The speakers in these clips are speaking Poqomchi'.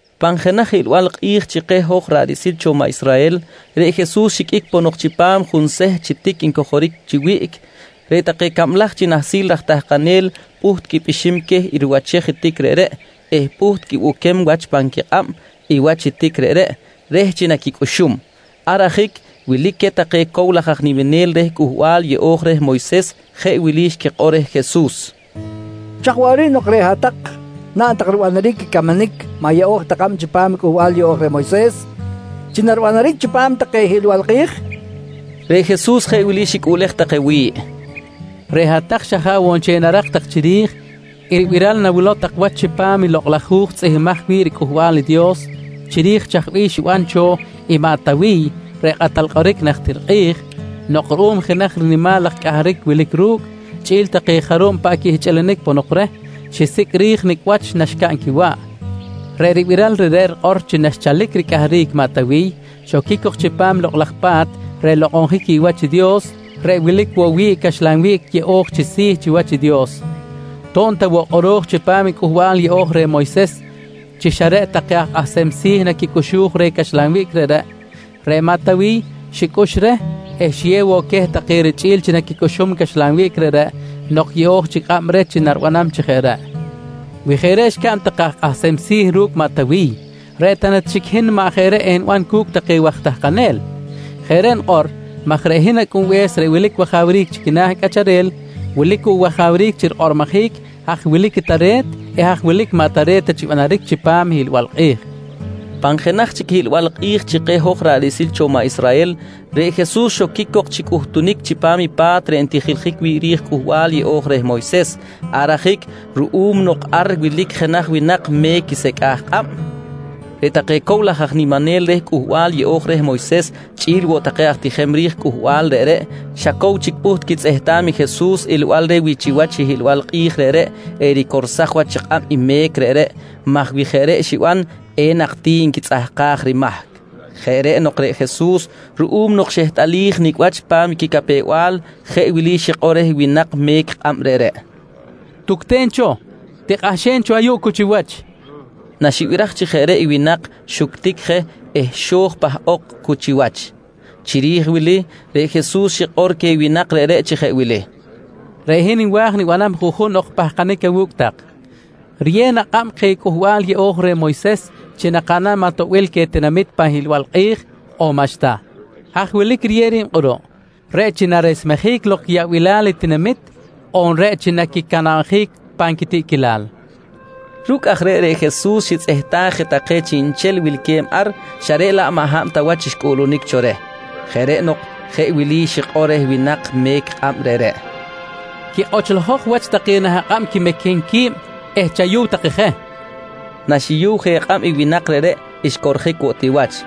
Pan jenaj hiꞌlbal kꞌi̱j chi keh hoj ra̱ꞌ riꞌsil cho maꞌ Israhel, reꞌ Jesus xiqꞌuic ponok chipam junseht chi tic ncojoric chi wiꞌc, reꞌ take cablaj chi nahsil raj tahkanel pꞌuht quipꞌixim queh i riwachej i tic reꞌreꞌ eh pꞌuht quibuquem wach pan quikꞌab i wach i tic reꞌreꞌ reh chi naquicꞌuxum. Ar ajic wilic queh take cow laj aj niminel reh Cꞌuhbal Yeꞌo̱j reh Moyses jeꞌ wili xquikꞌor reh Jesus: «Chaj waꞌric nok reꞌ hat-tak naꞌn tak ribanaric i camanic maꞌ yeꞌo̱j ta kꞌab chipam i Cꞌuhbal Yeꞌo̱j reh Moyses chi naribanaric chipam take hiꞌlbal kꞌi̱j? nqui take reh. Reꞌ Jesus jeꞌ wili xicꞌuꞌlej take wi̱ꞌ: «Reꞌ hat-tak xa jaꞌ woꞌ nchel narak ta tak chiri̱j i ribiral nawilow tak wach chipam i Lokꞌ laj Hu̱j tzꞌihmbimaj wi̱ꞌ riCꞌuhbal i Dios chiri̱j chaj bih xiban cho i maꞌ Tawiy reꞌ kꞌatal kꞌoric najtir kꞌi̱j nok ruꞌum jenaj rinimal laj cꞌahric wilic ru̱cꞌ chꞌi̱l take jarub paꞌ quihchꞌilinic ponok reh, xisicꞌ ri̱j nicꞌ wach naxcaꞌn quiwaꞌ. Reꞌ ribiral reꞌreꞌ rikꞌor chi naxchalic ricꞌahric maꞌ Tawiy, xoquic cok chipam i Lokꞌ laj Pa̱t reꞌ nlokꞌonjic wi̱ꞌ wach i Dios reꞌ wilic woꞌ wi̱ꞌ i caxlan wiꞌc yeꞌo̱j chi si̱ chiwach i Dios. To̱b ta woꞌ kꞌoro̱j chipam i Cꞌuhbal Yeꞌo̱j reh Moyses chi xa reꞌ take aj kꞌahsem si̱ naquicꞌuxuj reh caxlan wiꞌc reꞌreꞌ, reꞌ maꞌ Tawiy xicꞌux reh eh xiyew woꞌ queh take richꞌi̱l chi naquicꞌuxum caxlan wiꞌc reꞌreꞌ nok yeꞌo̱j chic kꞌab reh chi naribanam chi jeꞌ reꞌ. Wi jeꞌ reꞌ xcaꞌn take aj kꞌahsem si̱ ru̱cꞌ maꞌ Tawiy, reꞌ ta na chic i hin maꞌ jeꞌ reꞌ eniban cu̱cꞌ take waj tahkanel? Jeꞌ reꞌ nikꞌor maj reꞌ hin Acꞌunbe̱s reꞌ wilic wajawric chi quina̱ cꞌacharel, wilic woꞌ wajawric chi rikꞌormojic haj wilic i tare̱t eh haj wilic i maꞌ tare̱t ta chi banaric chipam i hiꞌlbal kꞌi̱j, nqui Jesus queh. Pan jenaj chic hiꞌlbal kꞌi̱j chi keh hoj ra̱ꞌ riꞌsil cho maꞌ Israhel, reꞌ Jesus xoquic cok chi cꞌuhtunic chipam i pa̱t reꞌ ntijiljic wi̱ꞌ ri̱j i Cꞌuhbal Yeꞌo̱j reh Moyses. Ar ajic ruꞌum nok ar wilic jenaj winak me̱c i secꞌaj kꞌab, reꞌ take cow laj aj niminel reh Cꞌuhbal Yeꞌo̱j reh Moyses chꞌi̱l woꞌ take aj tijem ri̱j cꞌuhbal reꞌreꞌ xa cow chic pꞌuht quitzꞌehtam i Jesus ilbal reh wi chiwach i hiꞌlbal kꞌi̱j reꞌreꞌ ericorsaj wach kꞌab i me̱c reꞌreꞌ maj wi jeꞌ reꞌ xiban, enak ti nquitzꞌahkaj rimahc. Jeꞌ reꞌ nok reꞌ Jesus, ruꞌum nok xehtꞌalij nicꞌ wach pa̱m i quicapew-bal, jeꞌ wili xikꞌor reh winak me̱c kꞌab reꞌreꞌ: «Tucten cho, tikꞌahxen cho ayuꞌ cu chiwach, nqui reh. Naxibiraj chi jeꞌ reꞌ i winak, xuctic je eh xo̱j pahꞌok cu chiwach. Chiri̱j wili reꞌ Jesus xikꞌor queh winak reꞌreꞌ chi jeꞌ wili: «Reꞌ hin nwa̱j nibanam juꞌjun ok pahkanic awu̱cꞌ tak: Riyew na kꞌab keh i Cꞌuhbal Yeꞌo̱j reh Moyses chi nakaꞌnam atoꞌbil queh tinamit pan hiꞌlbal kꞌi̱j on maꞌxta? Haj wilic riyew ri̱b kꞌuruꞌ, reꞌ chi naresmejic lok quiyaꞌbilal i tinamit on reꞌ chi naquicanabjic pan quitiꞌquilal? nqui queh. Ru̱cꞌ aj reꞌ, reꞌ Jesus xitzꞌehtaj je take chiꞌnchel wilque̱b ar xa reꞌ laꞌ maꞌ hab ta wach xcꞌuꞌlunic cho reh. Jeꞌ reꞌ nok jeꞌ wili xikꞌor reh winak me̱c i kꞌab reꞌreꞌ: «Quikꞌochlojok wach take nah akꞌab quimequem qui̱b eh chayu̱w take je, nqui reh. Naxiyuw je kꞌab i winak reꞌreꞌ xcorjic woꞌ ti wach.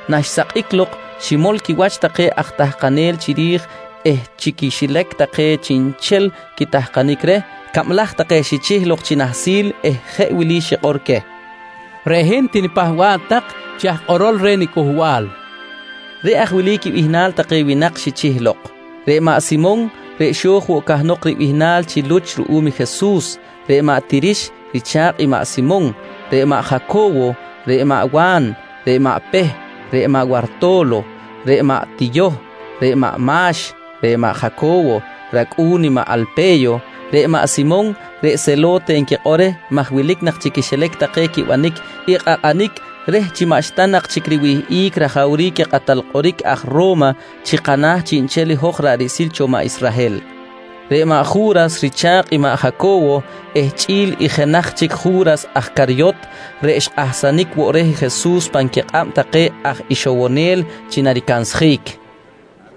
Naxsakꞌic lok ximol quiwach take aj tahkanel chiri̱j eh chi quixilac take chiꞌnchel quitahkanic reh, cablaj take xichih lok chi nahsil eh jeꞌ wili xikꞌor queh: «Reꞌ hin tinipahba̱ꞌ tak chi aj kꞌorol reh niCꞌuhbal, nqui queh. Reꞌ aj wili quibihnal take winak xichih lok: Reꞌ maꞌ Simon reꞌ xo̱j woꞌ cahnok ribihnal chi Luch ruꞌum i Jesus, reꞌ maꞌ Tirix richa̱kꞌ i maꞌ Simon, reꞌ maꞌ Jaco̱wo, reꞌ maꞌ Wa̱n, reꞌ maꞌ Peh, reꞌ maꞌ Warto̱lo, reꞌ maꞌ Tiyoh, reꞌ maꞌ Ma̱x, reꞌ maꞌ Jaco̱wo racꞌu̱n i maꞌ Alpe̱yo, reꞌ maꞌ Simon reꞌ Selo̱te nquikꞌor reh maj wilic nak chi quixilac take quibanic i kꞌakꞌanic reh chi maꞌxta nak chic riwihꞌic rajawric i kꞌatal kꞌoric aj Ro̱ma chi kana̱ chiꞌnchel i hoj ra̱ꞌ riꞌsil cho maꞌ Israhel; reꞌ maꞌ Ju̱ras richa̱kꞌ i maꞌ Jaco̱wo, eh chꞌi̱l i jenaj chic Ju̱ras aj Caryot reꞌ xkꞌahsanic woꞌ reh Jesus pan quikꞌab take aj ixowonel chi naricansjic.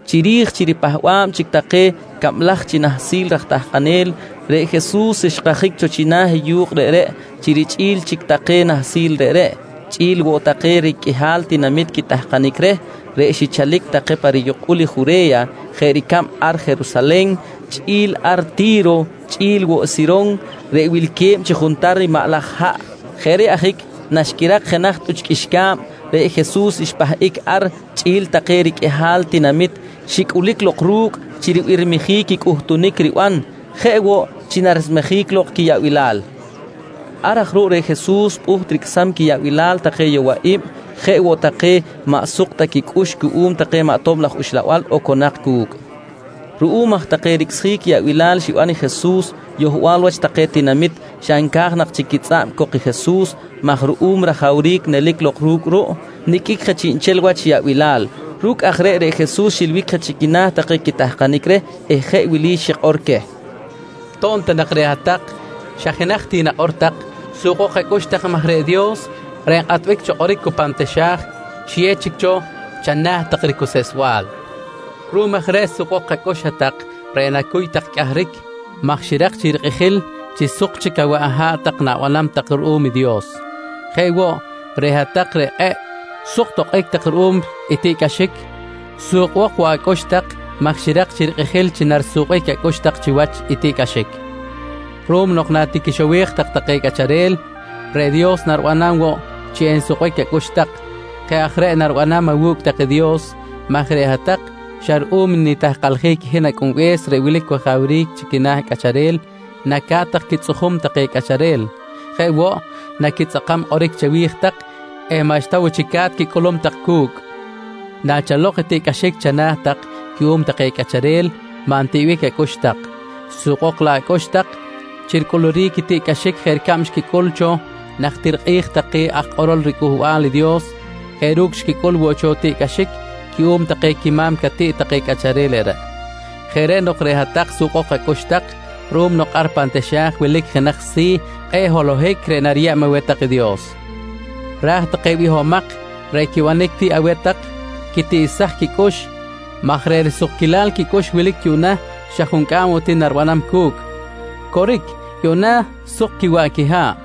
Chiri̱j chi ripahba̱b chic take cablaj chi nahsil raj tahkanel, reꞌ Jesus xkajic cho china̱ i yu̱kꞌ reꞌreꞌ chi richꞌi̱l chic take nahsil reꞌreꞌ, chꞌi̱l woꞌ take riqꞌuihal tinamit quitahkanic reh reꞌ xichalic take pa riyukꞌul Jure̱ya, jeꞌ ricab ar Jerusalen chꞌi̱l ar Ti̱ro chꞌi̱l woꞌ i Siron reꞌ wilque̱b chi juntar i maꞌ laj haꞌ. Jeꞌ reꞌ ajic naxquirak jenaj tꞌuch qꞌuixca̱b, reꞌ Jesus xpahꞌic ar chꞌi̱l take riqꞌuihal tinamit xicꞌulic lok ru̱cꞌ chi ribirmijic i cꞌuhtunic riban jeꞌ woꞌ chi naresmejic lok quiyaꞌbilal. Ar aj ruꞌ reꞌ Jesus pꞌuht ricꞌsam quiyaꞌbilal take yowaꞌi̱b jeꞌ woꞌ take maꞌ suk ta quicꞌux cuꞌum take maꞌ tob laj uxlabal oconak cu̱cꞌ. Ruꞌum aj take ricꞌsjic yaꞌbilal xiban i Jesus, yohbal wach take tinamit xa nca̱j nak chic quitzꞌa̱b cok i Jesus maj ruꞌum rajawric nelic lok ru̱cꞌ ruꞌ, niqꞌuic je chiꞌnchel wach yaꞌbilal. Ru̱cꞌ aj reꞌ, reꞌ Jesus xilbic je chi quina̱ take quitahkanic reh eh jeꞌ wili xikꞌor queh: «To̱b ta nak reꞌ hat-tak xa jenaj ti nakꞌor tak, sukbok acꞌux tak maj reꞌ Dios reꞌ nkꞌatbic cho kꞌoric cu pan taxa̱j xiyew chic cho chana̱ tak i ricuseꞌsbal. Ruꞌum aj reꞌ sukbok acꞌux hat-tak reꞌ nacuy tak cꞌahric, maj xirak chic rikꞌijil chi suk chic awaꞌ aha̱ꞌ na̱banam tak ruꞌum i Dios. «Jeꞌ woꞌ, reꞌ hat-tak reꞌ kꞌe̱ꞌ suk tokꞌic tak ruꞌum i tiꞌcꞌaxic sukbok woꞌ acꞌux tak maj xirak chic rikꞌijil chi narisukbic acꞌux tak chiwach i tiꞌcꞌaxic ruꞌum nok natiquixowej tak take cꞌacharel, reꞌ Dios naribanam woꞌ chi ensukbic acꞌux tak. Jeꞌ aj reꞌ naribanam awu̱cꞌ tak i Dios maj reꞌ hat-tak xa ruꞌum nitahkaljic i hin Acꞌunbe̱s reꞌ wilic wajawric chi quina̱ cꞌacharel, naca̱t tak quitzꞌujum take cꞌacharel. Jeꞌ woꞌ, naquitzꞌakam kꞌoric chawi̱j tak eh maꞌxta woꞌ chic ca̱t quicꞌulum tak cu̱cꞌ. «Nachalok i tiꞌcꞌaxic chana̱ tak cuꞌum take cꞌacharel, maꞌ ntiꞌbic acꞌux tak, sukbok laꞌ acꞌux tak chi ricꞌuluric i tiꞌcꞌaxic jeꞌ ricab xquicꞌul cho najtir kꞌi̱j take aj kꞌorol riCꞌuhbal i Dios jeꞌ ru̱cꞌ xquicꞌul woꞌ cho tiꞌcꞌaxic cuꞌum take quima̱m catiꞌt take cꞌacharel reꞌreꞌ. Jeꞌ reꞌ nok reꞌ hat-tak sukbok acꞌux tak, ruꞌum nok ar pan taxa̱j wilic jenaj si̱ kꞌe̱ꞌ holohic reꞌ nariyeb aweh tak i Dios. Raj take bihomak reꞌ quibanic tiꞌ aweh tak, quitiꞌsaj quicꞌux maj reꞌ risukquilal quicꞌux wilic yuꞌna xa juncꞌam woꞌ ti naribanam cu̱cꞌ. Coric, yuꞌna suk quiwaꞌ quiha̱ꞌ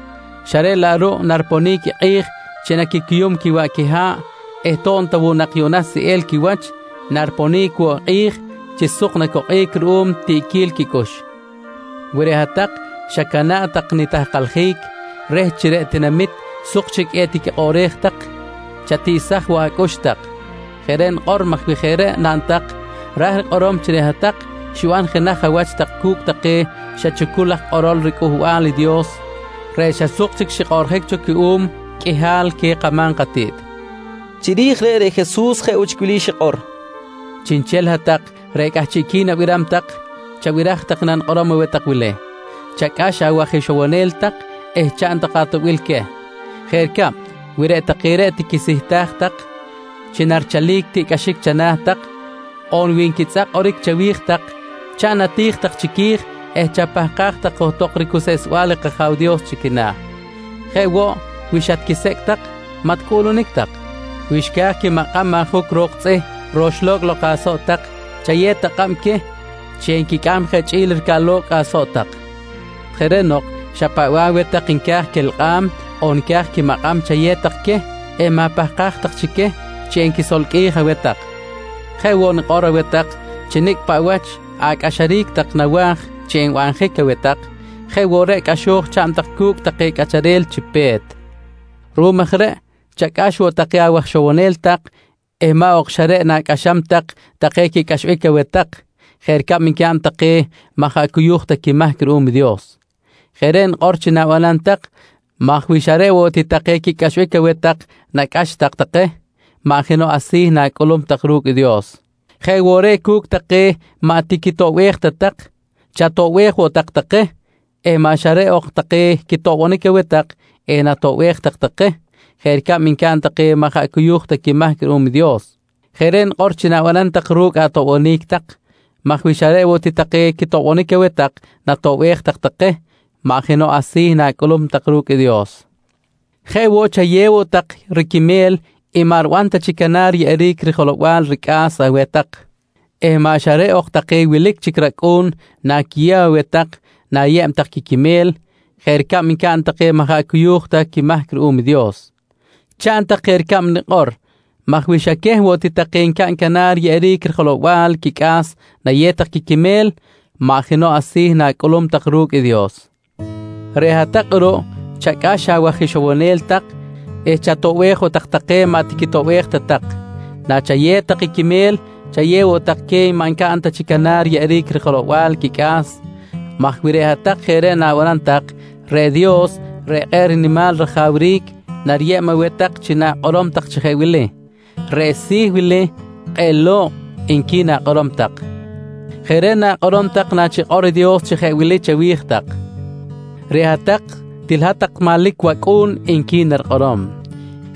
xa reꞌ laꞌ ruꞌ nariponic i kꞌi̱j chi naquicuyum quiwaꞌ quiha̱ꞌ eh to̱b ta woꞌ yuꞌna seꞌel quiwach, nariponic woꞌ i kꞌi̱j chi suk nacokꞌic ruꞌum tiꞌquil quicꞌux. «Wi reꞌ hat-tak xacana̱ꞌ tak nitahkaljic reh chi reꞌ tinamit suk chic etiquikꞌoꞌrej tak, chatiꞌsaj woꞌ acꞌux tak. Jeꞌ reꞌ nikꞌor maj wi jeꞌ reꞌ naꞌn tak, ra̱j rikꞌorom chi reꞌ hat-tak xiban jenaj awach tak cu̱cꞌ take xa chucul aj kꞌorol riCꞌuhbal i Dios reꞌ xa suk chic xikꞌoꞌrjic cho cuꞌum qꞌuihal queh kama̱m katiꞌt, nqui Jesus. Chiri̱j reꞌ, reꞌ Jesus jeꞌ woꞌ chic wili xikꞌor: «Chiꞌnchel hat-tak reꞌ cꞌahchiꞌqui̱n abiram tak chabiraj tak i nanikꞌorom aweh tak wili: Chacꞌax awaj ixowonel tak eh chaꞌn tak atoꞌbil queh. Jeꞌ ricab wi reꞌ take reꞌ tiquisihtaj tak chi narichalic tiꞌcꞌaxic chana̱ tak on wi nquitzꞌak kꞌoric chawi̱j tak, chaꞌn ati̱j tak chiqui̱j eh chapahkaj tak johtok ricuseꞌsbal i kAja̱w Dios chi quina̱. Jeꞌ woꞌ wi xatquisecꞌ tak, maꞌ ticꞌuꞌlunic tak. Wi xca̱j quimakꞌam ajuc ro̱k tzꞌih roxlo̱cꞌ lok asoꞌ tak, chayew tak kꞌab queh chi enquicꞌam je chꞌi̱l ricaꞌlo̱cꞌ asoꞌ tak. Jeꞌ reꞌ nok, xa paꞌ bih aweh tak nca̱j quelkꞌam on nca̱j quimakꞌam, chayew tak queh eh ma̱pahkaj tak chic queh chi enquisolqꞌui̱j aweh tak. «Jeꞌ woꞌ nikꞌor aweh tak chi nicꞌ paꞌ wach acꞌaxaric tak nawa̱j chi naribanjic aweh tak, jeꞌ woꞌ reꞌ cꞌaxo̱j chaꞌn tak cu̱cꞌ take cꞌacharel chi pe̱t. Ruꞌum aj reꞌ chacꞌax woꞌ take awaj ixowonel tak eh maꞌ ok xa reꞌ nacꞌaxam tak take quicꞌaxbic aweh tak jeꞌ ricab ncaꞌn take maꞌ jaꞌ cuyu̱j ta quimahc ruꞌum i Dios. Jeꞌ reꞌ nikꞌor chi na̱banam tak maj wi xa reꞌ woꞌ ti take quicꞌaxbic aweh tak nacꞌax tak take, maꞌ jenoꞌ asi̱ na̱cꞌulum tak ru̱cꞌ i Dios. Jeꞌ woꞌ reꞌ cu̱cꞌ take maꞌ tiquitoꞌbej ta tak, chatoꞌbej woꞌ tak take eh maꞌ xa reꞌ ok take quitoꞌbonic aweh tak enatoꞌbej tak take jeꞌ ricab ncaꞌn take maꞌ jaꞌ cuyu̱j ta quimahc ruꞌum i Dios. Jeꞌ reꞌ nikꞌor chi na̱banam tak ru̱cꞌ atoꞌbonic tak maj wi xa reꞌ woꞌ ti take quitoꞌbonic aweh tak natoꞌbej tak take, maꞌ jenoꞌ asi̱ na̱cꞌulum tak ru̱cꞌ i Dios. «Jeꞌ woꞌ, chayew woꞌ tak riquime̱l i maꞌ riban ta chic canar riyeꞌeric jelow-bal ricꞌa̱s aweh tak eh maꞌ xa reꞌ ok take wilic chic racꞌu̱n naquiyew aweh tak na̱yeb tak quiquimel jeꞌ ricab ncaꞌn take maꞌ jaꞌ cuyu̱j ta quimahc ruꞌum i Dios. Chaꞌn tak jeꞌ ricab nikꞌor maj wi xa queh woꞌ take ncaꞌn canar riyeꞌeric jelow-bal quicꞌa̱s nayew tak quimel, maꞌ jenoꞌ asi̱ na̱cꞌulum tak ru̱cꞌ i Dios. Reꞌ hat-tak kꞌuruꞌ chacꞌax awaj ixowonel tak eh chatoꞌbej woꞌ tak take maꞌ tiquitoꞌbej ta tak. Nachayew tak i quimel, chayew woꞌ tak queh maꞌ ncaꞌn ta chic canar riyeꞌeric rijelow-bal quicꞌa̱s maj wi reꞌ hat-tak jeꞌ reꞌ na̱banam tak, reꞌ Dios reꞌ kꞌe̱ꞌ nimal rajawric nariyeb aweh tak chi na̱kꞌorom tak chi jeꞌ wili: ‹Reꞌ si̱ wili kꞌe̱ꞌ lo̱kꞌ, nqui na̱kꞌorom tak. «Jeꞌ reꞌ na̱kꞌorom tak nachikꞌor i Dios chi jeꞌ wili chawi̱j tak: ‹Reꞌ hat-tak til hat-tak manlic wacꞌu̱n, nqui narikꞌorom.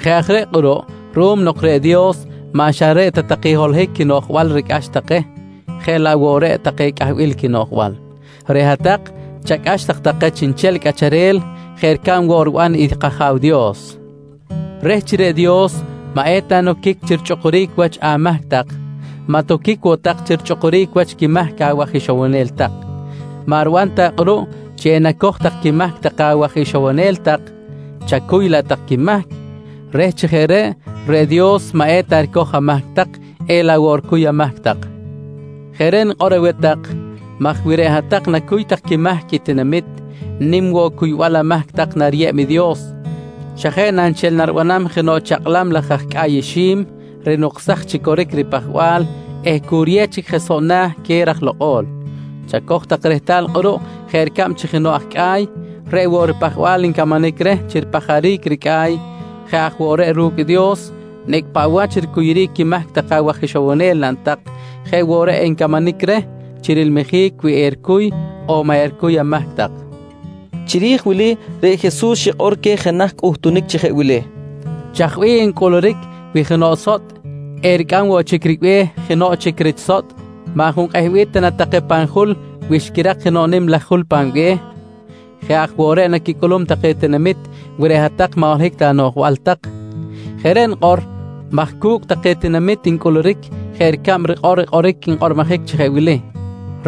«Jeꞌ aj reꞌ kꞌuruꞌ ruꞌum nok reꞌ Dios maꞌ xa reꞌ ta take holohic quinoꞌjbal ricꞌax take jeꞌ laꞌ woꞌ reꞌ take cꞌahbil quinoꞌjbal, reꞌ hat-tak chacꞌax tak take chiꞌnchel cꞌacharel jeꞌ ricab woꞌ riban i kAja̱w Dios. «Reh chi reꞌ Dios maꞌ eta noquic chi richꞌukuric wach amahc tak, maꞌ toquic woꞌ tak chi richꞌukuric wach quimahc awaj ixowonel tak. Maꞌ riban ta kꞌuruꞌ chi enacoj tak quimahc take awaj ixowonel tak, chacuy laꞌ tak quimahc reh chi jeꞌ reꞌ, reꞌ Dios maꞌ eta ricoj amahc tak elaꞌ woꞌ ricuy amahc tak. Jeꞌ reꞌ nikꞌor aweh tak maj wi reꞌ hat-tak nacuy tak quimahc i tinamit, nim woꞌ cuybal amahc tak nariyeb i Dios xa jeꞌ na nchel naribanam jenoꞌ chakꞌlam laj aj cꞌa̱y ixi̱m rinuksaj chi coric i ripajbal eh cu riyew chic je soꞌ na̱ queh raj lokꞌo̱l. Chacoj tak rehtal kꞌuruꞌ jeꞌ ricab chi jenoꞌ aj cꞌa̱y, reꞌ woꞌ i ripajbal ncamanic reh chi ripajaric i ricꞌa̱y, jeꞌ aj woꞌ reꞌ ru̱cꞌ i Dios, nicꞌ paꞌ wach ricuyuric quimahc take awaj ixowonel naꞌn tak, jeꞌ woꞌ reꞌ encamanic reh chi rilmijic wi ericuy on maꞌ ericuy amahc tak, nqui Jesus. Chiri̱j wili, reꞌ Jesus xikꞌor queh jenaj cꞌuhtunic chi jeꞌ wili: «Chaj bih encꞌuluric wi jenoꞌ sotꞌ ericꞌam woꞌ chic ribe̱h jenoꞌ chic rich sotꞌ? Maꞌ junkꞌehbic ta na take pan jul, wi xquirak jenoꞌ nim laj jul pan be̱h? Jeꞌ aj woꞌ reꞌ naquicꞌulum take tinamit, wi reꞌ hat-tak maꞌ holohic anoꞌjbal tak. Jeꞌ reꞌ nikꞌor maj cu̱cꞌ take tinamit ncꞌuluric jeꞌ ricab rikꞌor i kꞌoric nkꞌormojic chi jeꞌ wili: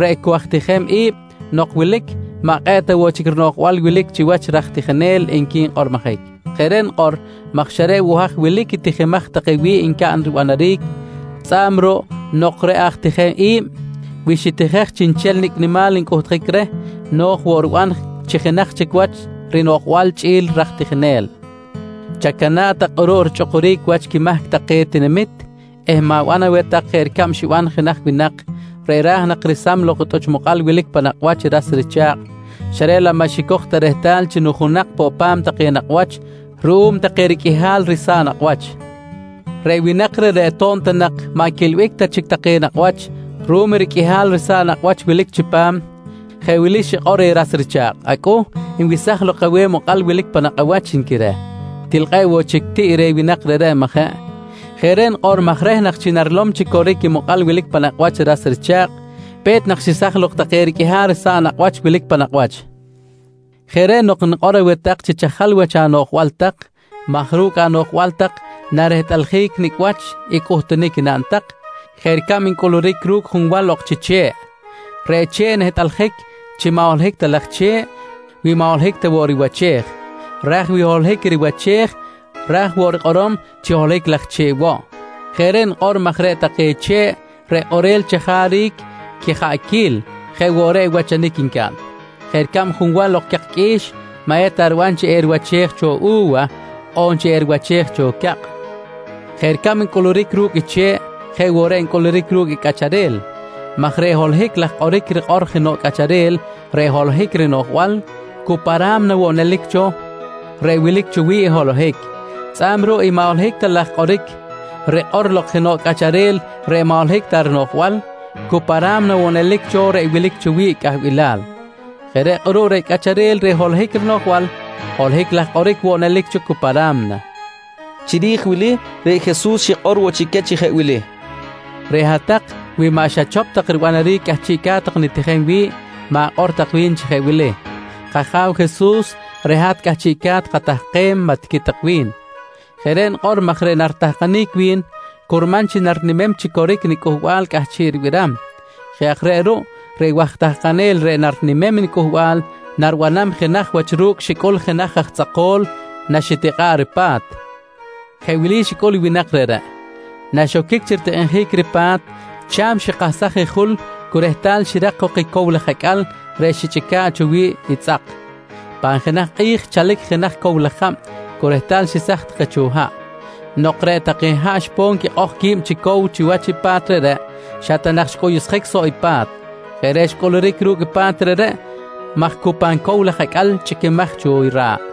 ‹Reꞌ cu aj tijem i̱b nok wilic maꞌ kꞌe̱ꞌ ta woꞌ chic rinoꞌjbal wilic chiwach i raj tijinel, nqui nkꞌormojic. «Jeꞌ reꞌ nikꞌor maj xa reꞌ woꞌ haj wilic i tijimaj take wi̱ꞌ ncaꞌn ribanaric, tzꞌa̱b ruꞌ nok reꞌ aj tijem i̱b wi xitijej chiꞌnchel nicꞌ nimal ncꞌuhtjic reh, no̱j woꞌ riban chi jenaj chic wach rinoꞌjbal chꞌi̱l i raj tijinel. Chacana̱ꞌ tak kꞌuruꞌ richꞌukuric wach quimahc take tinamit eh ma̱ban aweh tak jeꞌ ricab xiban jenaj winak reꞌ ra̱j nak resam lok i tꞌuch mokꞌal wilic pan nakꞌ wach i ras richa̱kꞌ xa reꞌ laꞌ maꞌ xicoj ta rehtal chi nujunak poꞌ pa̱m take nakꞌ wach ruꞌum take riqꞌuihal risa̱ꞌ nakꞌ wach. Reꞌ winak reꞌreꞌ, to̱b ta nak maꞌ quiꞌilbic ta chic take nakꞌ wach ruꞌum i riqꞌuihal risa̱ꞌ nakꞌ wach wilic chipam, jeꞌ wili xikꞌor reh ras richa̱kꞌ: ‹Acꞌuh, nwesaj lok aweh i mokꞌal wilic pan nakꞌ awach, nqui reh. «Til kꞌe̱ꞌ woꞌ chic tiꞌ reh winak reꞌreꞌ, majeꞌ? Jeꞌ reꞌ nikꞌor maj reh nak chi narilom chi coric i mokꞌal wilic pan nakꞌ wach i ras richa̱kꞌ, pe̱t nak xesaj lok take riqꞌuihal risa̱ꞌ nakꞌ wach wilic pan nakꞌ wach. «Jeꞌ reꞌ nok nikꞌor aweh tak chi chajal tak wach anoꞌjbal maj ru̱cꞌ anoꞌjbal tak narehtꞌaljic nicꞌ wach i cꞌuhtunic naꞌn tak jeꞌ ricab ncꞌuluric ru̱cꞌ junwal ok chi che̱ꞌ. Reꞌ che̱ꞌ nehtꞌaljic chi maꞌ holohic ta laj che̱ꞌ wi maꞌ holohic ta woꞌ riwachej. Raj wi holohic riwachej raj woꞌ rikꞌorom chi holohic laj che̱ꞌ woꞌ. Jeꞌ reꞌ nikꞌor maj reꞌ take che̱ꞌ reꞌ kꞌorel chajaric quijaꞌquil jeꞌ woꞌ reꞌ wachanic ncaꞌn. Jeꞌ ricab junwal ok chi cak qꞌui̱x maꞌ eta riban chi eriwachej cho u̱wa on chi eriwachej cho cakꞌ. «Jeꞌ ricab ncꞌuluric ru̱cꞌ i che̱ꞌ jeꞌ woꞌ reꞌ ncꞌuluric ru̱cꞌ i cꞌacharel maj reꞌ holohic laj kꞌoric rikꞌor jenoꞌ cꞌacharel reꞌ holohic rinoꞌjbal, cu pa ra̱mna woꞌ nelic cho reꞌ wilic cho wi̱ꞌ i holohic. Tzꞌa̱b ruꞌ i maꞌ holohic ta laj kꞌoric rikꞌor lok jenoꞌ cꞌacharel reꞌ maꞌ holohic ta rinoꞌjbal, cu pa ra̱mna woꞌ nelic cho reꞌ wilic cho wi̱ꞌ cꞌahbilal. Jeꞌ reꞌ kꞌuruꞌ reꞌ cꞌacharel reꞌ holohic rinoꞌjbal, holohic laj kꞌoric woꞌ nelic cho cu pa ra̱mna, nqui Jesus. Chiri̱j i wili, reꞌ Jesus xikꞌor woꞌ chic queh chi jeꞌ wili: «Reꞌ hat-tak, wi maꞌ xachop tak ribanaric i cꞌahchiꞌca̱t tak nitijem wi̱ꞌ, ma̱kꞌor tak wi̱n chi jeꞌ wili: ‹K-Aja̱w Jesus, reꞌ hat cꞌahchiꞌca̱t katahkem, maꞌ tiqui tak wi̱n. «Jeꞌ reꞌ nikꞌor maj reꞌ naritahkanic wi̱n curman chi narinimem chi coric i nicꞌuhbal cꞌahchiꞌ ribiram. Jeꞌ aj reꞌ ruꞌ, reꞌ waj tahkanel reꞌ narinimem i nicꞌuhbal naribanam jenaj wach ru̱cꞌ xicꞌul jenaj aj tzꞌako̱l naxitikꞌa̱ꞌ ripa̱t. Jeꞌ wili xicꞌul i winak reꞌreꞌ: Naxoquic chi ritikꞌinjic ripa̱t, cha̱m xikahsaj i jul cu rehtal xirak jok i cow laj acꞌal reꞌ xichꞌica̱ꞌ cho wi̱ꞌ i tzꞌak. Pan jenaj kꞌi̱j xchalic jenaj cow laj jab cu rehtal xesaj take cho haꞌ. Nok reꞌ take haꞌ xponic quikꞌoj qui̱b chi cow chiwach i pa̱t reꞌreꞌ, xa ta nak je xcꞌuyuꞌsjic soꞌ i pa̱t. Jeꞌ reꞌ xcꞌuluric ru̱cꞌ i pa̱t reꞌreꞌ maj cu pan cow laj acꞌal chꞌiquimaj cho i ra̱ꞌ.